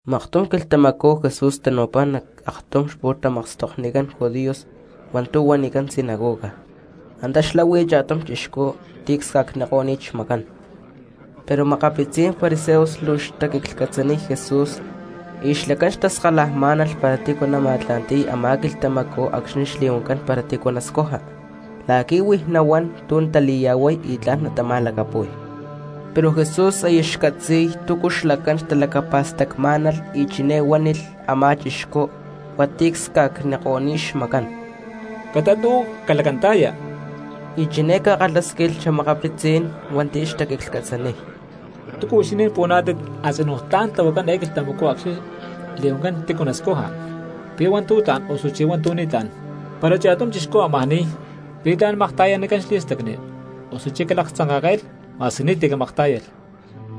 Maktum quilhtamacú Jesús tanu̠pá nac aktum xpu̠tamakstoknicán judíos hua̠ntu̠ huanicán sinagoga, antá xlahui cha̠tum chixcú ti̠ csca̠cniko̠ni̠t xmacán. Pero makapitzí̠n fariseos luu xtaquiclhcatzaniy Jesús y xlacán xtaskalajmá̠nalh para tícu nama̠tla̠nti̠y a̠má quilhtamacú acxni̠ li̠huancán para tícu nascuja, la̠qui̠ huij nahuán tu̠ natali̠ya̠huay y tla̠n natama̠lacapu̠y. Pero Jesús aya xcatzi̠y túcu xlacán xtalacapa̠stacmá̠nalh y chiné huánilh a̠má chixcú hua̠nti̠ csca̠cko̠ni̠t xmacán: —Catat y uú calacanta̠ya. Y chiné ca̠kalhásquilh xa̠makapitzí̠n hua̠nti̠ xtaquiclhcatzaniy: —¿Túcu huixinín puhuaná̠tit a̠tzinú tla̠n tlahuacán eé quilhtamacú acxni̠ li̠huancán tícu nascuja, pi̠ hua̠ntu̠ tla̠n osuchí hua̠ntu̠ ni̠tlá̠n? Para cha̠tum chixcú amajá ni̠y, ¿pi̠ tla̠n makta̠yanicán xli̠stacni, osuchí calaktzanka̠ke̠lh ma̠squi ni̠ti̠ camaktá̠yalh?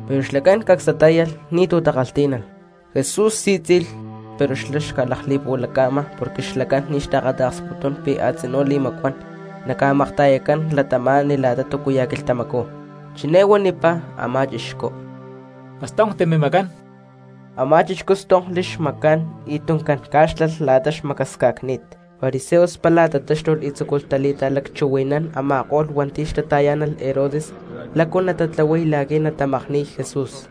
Pero xlacán cacs tatá̠yalh ni̠tu̠ takalhtí̠nalh. Jesús sí̠tzi̠lh pero xca̠lakli̠puhualaca̠ma porque xlacán ni̠ xtaakata̠ksputún pi̠ a̠tzinú li̠macuán naca̠makta̠yacán cristianos la̠ta túcuya̠ quilhtamacú. Chiné huanipá a̠má chixcú: —Castonkti mimacán. Amá chixcú stonkli xmacán y tuncán cá̠xlalh la̠ta xmacasca̠cni̠t. Fariseos pála tatáxtulh y tzúculh tali̠ta̠lacchuhui̠nán a̠ma̠ko̠lh hua̠nti̠ xtata̠yá̠nalh Herodes lácu natatlahuay la̠quí̠ natamakni̠y Jesús.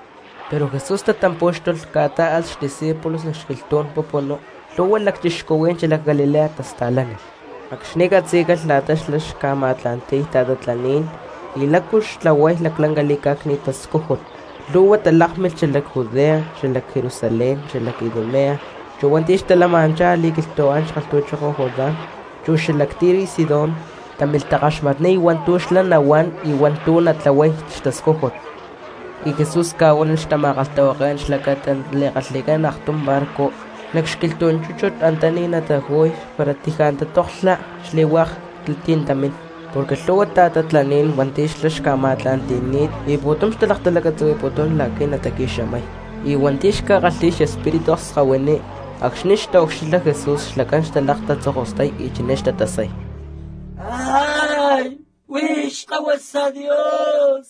Pero Jesús tatampú̠xtulh ca̠tá̠alh xdiscípulos nac xquilhtú̠n pupunú, lhu̠hua lacchixcuhuí̠n xalac Galilea tasta̠lánilh. Acxni̠ catzí̠calh la̠ta xlá xca̠ma̠tla̠nti̠y ta̠tatlaní̠n y lácu xtlahuay laclanca li̠cá̠cni̠t tascújut, lhu̠hua cristianos talákmilh xalac Judea, xalac Jerusalén, xalac Idumea, chu hua̠nti̠ xtalama̠nanchá a̠li̠quilhtu̠án kalhtu̠choko Jordán, chu xalac Tiro y Sidón, támilh takaxmatniy hua̠ntu̠ xlá nahuán y hua̠ntu̠ natlahuay xtascújut. Y Jesús ca̠huánilh xtama̠kalhtahuaké̠n xlacata nali̠kalhi̠cán aktum barco nac xquilhtú̠n chúchut antaní nataju̠y para taji̠ natatoklha xli̠lhu̠hua cristianos. Porque lhu̠hua ta̠tatlaní̠n hua̠nti̠ xlá xca̠ma̠tla̠nti̠ni̠t y pu̠tum xtalaktalacatzuhui̠putún la̠qui̠ nataqui̠xamay. Y hua̠nti̠ xca̠kalhi̠y xespíritu akskahuiní, acxni̠ xtaucxilha Jesús xlacán xtalakatatzokostay y chiné xtatasay: —Huix Xkahuasa Dios.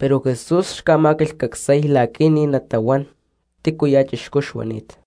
Pero Jesús xca̠ma̠quilhcacsay la̠qui̠ ni̠ natahuán tícuya̠ chixcú xuani̠t.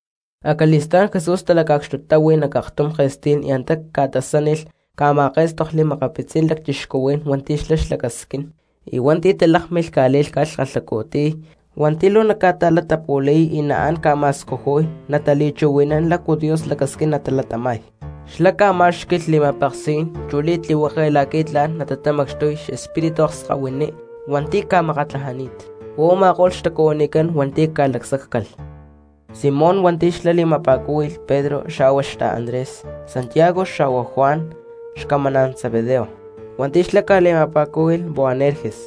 Acali̠stá̠n Jesús talaca̠cxtutáhui nac aktum ke̠stí̠n y antá ca̠tasánilh ca̠ma̠ké̠stokli makapitzí̠n lacchixcuhuí̠n hua̠nti̠ xlá xlacasquín, y hua̠nti̠ talákmilh ca̠lí̠lhca̠lh kalhacu̠tiy hua̠nti̠ luu naca̠ta̠latapu̠li̠y y naán ca̠ma̠scujuy natali̠chuhui̠nán lácu Dios lacasquín natalatama̠y cristianos. Y xlá ca̠má̠xqui̠lh li̠ma̠peksí̠n chu li̠tlihueke la̠qui̠ tla̠n natatamacxtuy xespíritu akskahuiní hua̠nti̠ ca̠makatlajani̠t. Huá u̠ma̠ko̠lh xtacuhuinicán hua̠nti̠ ca̠lacsáccalh: Simón hua̠nti̠ xlá li̠ma̠pa̠cúhui̠lh Pedro; xawa xtala Andrés, Santiago xa̠hua Juan xcamaná̠n Zebedeo, hua̠nti̠ xlá ca̠li̠ma̠pa̠cúhui̠lh Boanerges,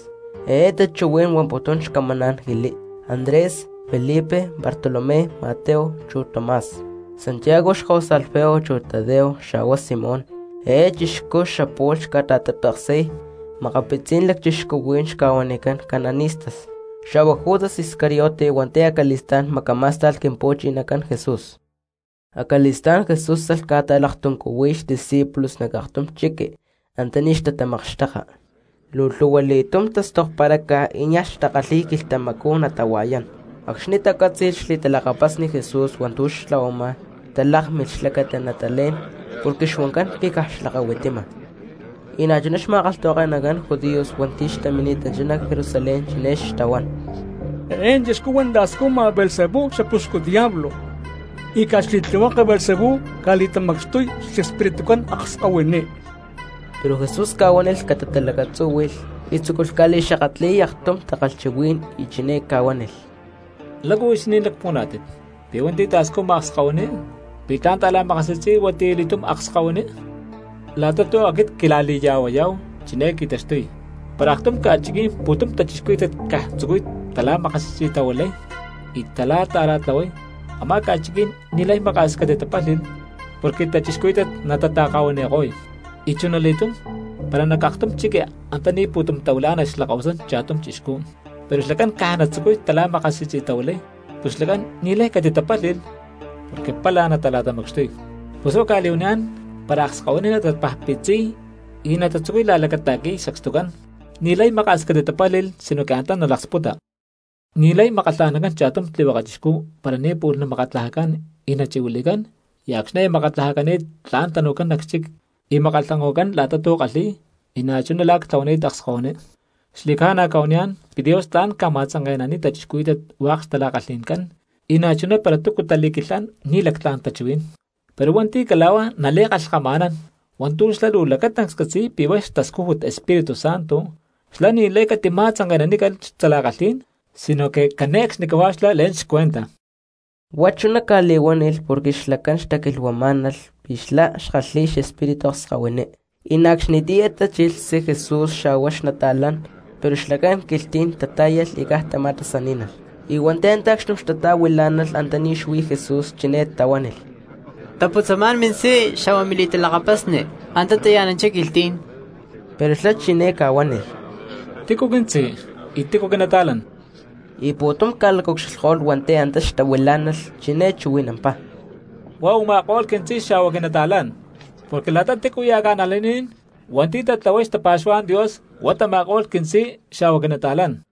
eé tachuhuí̠n huamputún Xcamán Jili; Andrés, Felipe, Bartolomé, Mateo chu Tomás; Santiago xkahuasa Alfeo; chu Tadeo; Xa̠hua Simón, eé chixcú xapu̠lh xca̠ta̠tapeksi̠y makapitzí̠n lacchixcuhuí̠n xca̠huanicán cananistas; xa̠hua Judas Iscariote hua̠nti̠ acali̠stá̠n macamá̠sta̠lh Quimpu̠chinacán Jesús. Acali̠stá̠n Jesús alh ca̠ta̠laktuncuhuiy xdiscípulos nac aktum chiqui antaní xtatamakxteka, luu lhu̠hua li̠tum tastokparaca y niaj xtakalhi̠y quilhtamacú natahua̠yán. Acxni̠ tacátzi̠lh xli̠talakapasni Jesús hua̠ntu̠ xtlahuama talákmilh xlacata natalé̠n, porque xuancán pi̠ caj xlakahuitima. Y na̠chuná xma̠kalhtahuake̠nacán judíos hua̠nti̠ xtamini̠tanchá nac Jerusalén chiné xtahuán: —Eé chixcú huá ta̠scujma Beelzebú xapuxcu diablo, y caj xli̠tlihueke Beelzebú ca̠li̠tamacxtuy xespiritucán akskahuiní. Pero Jesús ca̠huánilh catatalacatzúhui̠lh y tzúculh ca̠li̠xakatli̠y aktum takalhchuhuí̠n y chiné ca̠huánilh: —¿Lácu huixinín lacpuhuaná̠tit pi̠ hua̠nti̠ ta̠scujma akskahuiní pi̠ tla̠n ta̠la̠makasi̠tzi̠y huatiyali̠túm akskahuiní? La̠ta tu̠ aquit quila̠li̠ya̠huayá̠hu chiné qui̠taxtuy: para aktum ca̠chiquí̠n pu̠tum cristianos caj tzucuy tala̠makasi̠tzi̠tahuilay y tala̠ta̠ra̠tlahuay, a̠má ca̠chiquí̠n ni̠lay maka̠s catitapálhi̠lh porque cristianos natata̠kahuaniko̠y. Y chunali̠tum para nac aktum chiqui antaní pu̠tum tahuilá̠nalh xlakahuasán cha̠tum chixcú, pero xlacán caj natzucuy tala̠makasi̠tzi̠tahuilay, pus xlacán ni̠lay catitatapálhi̠lh porque pálaj natala̠tamacxtuy. Pus huá cca̠li̠huaniyá̠n para akskahuiní natatapajpitziy y natatzucuy la̠lacata̠qui̠y sacstucán ni̠lay maka̠s catitatapálhi̠lh sinoque antá natalaksputa. ’Ni̠lay makkalha̠nancán cha̠tum tlihueke chixcú para ni̠ pu̠lh namakatlajacán y nachi̠huili̠cán y acxni̠ aya makatlajacani̠t tla̠n tanu̠cán nac xchic y makkalhanko̠cán la̠ta tu̠ kalhi̠y, y na̠chuná la̠ ctlahuani̠t akskahuiní. ’Xli̠ca̠na cca̠huaniyá̠n pi̠ Dios tla̠n ca̠ma̠tzanke̠naniy cristianos hua̠k xtala̠kalhi̠ncán, y na̠chuná para túcu tali̠quilhán ni̠ lactlá̠n tachuhuí̠n. Pero hua̠nti̠ cala̠huá nali̠kalhkama̠nán hua̠ntu̠ xlá luu lacatancs catzi̠y pi̠ hua̠ xtascújut Espíritu Santo xlá ni̠lay catima̠tzanke̠nanícalh xtala̠kalhí̠n sinoque cane̠cxnicahuá xlá le̠n xcuenta. Huá chuná ca̠li̠huánilh porque xlacán xtaquilhuamá̠nalh pi̠ xlá xkalhi̠y xespíritu akskahuiní. Y na̠ acxnitiyá tachilh xtzí Jesús xa̠hua xnata̠lán, pero xlacán quilhtí̠n tatá̠yalh y caj tama̠tasaní̠nalh. Y hua̠nti̠ antá acxtum xtata̠huilá̠nalh antaní xlá xuí Jesús chiné tahuánilh: —Taputzamá̠n mintzí xa̠hua mili̠talakapasni, antá taya̠nanchá quilhtí̠n. Pero xlá chiné ca̠huánilh: —¿Tícu quintzí, y tícu quinata̠lán? Y pu̠tum ca̠lacaucxilhko̠lh hua̠nti̠ antá xtahuilá̠nalh, chiné chuhui̠nampá: —Huá u̠ma̠ko̠lh quintzí xa̠hua quinata̠lán. Porque la̠ta tícuya̠ cristiano hua̠nti̠ tatlahuay xtapa̠xuhuá̠n Dios huá tama̠ko̠lh quintzí xa̠hua quinata̠lán.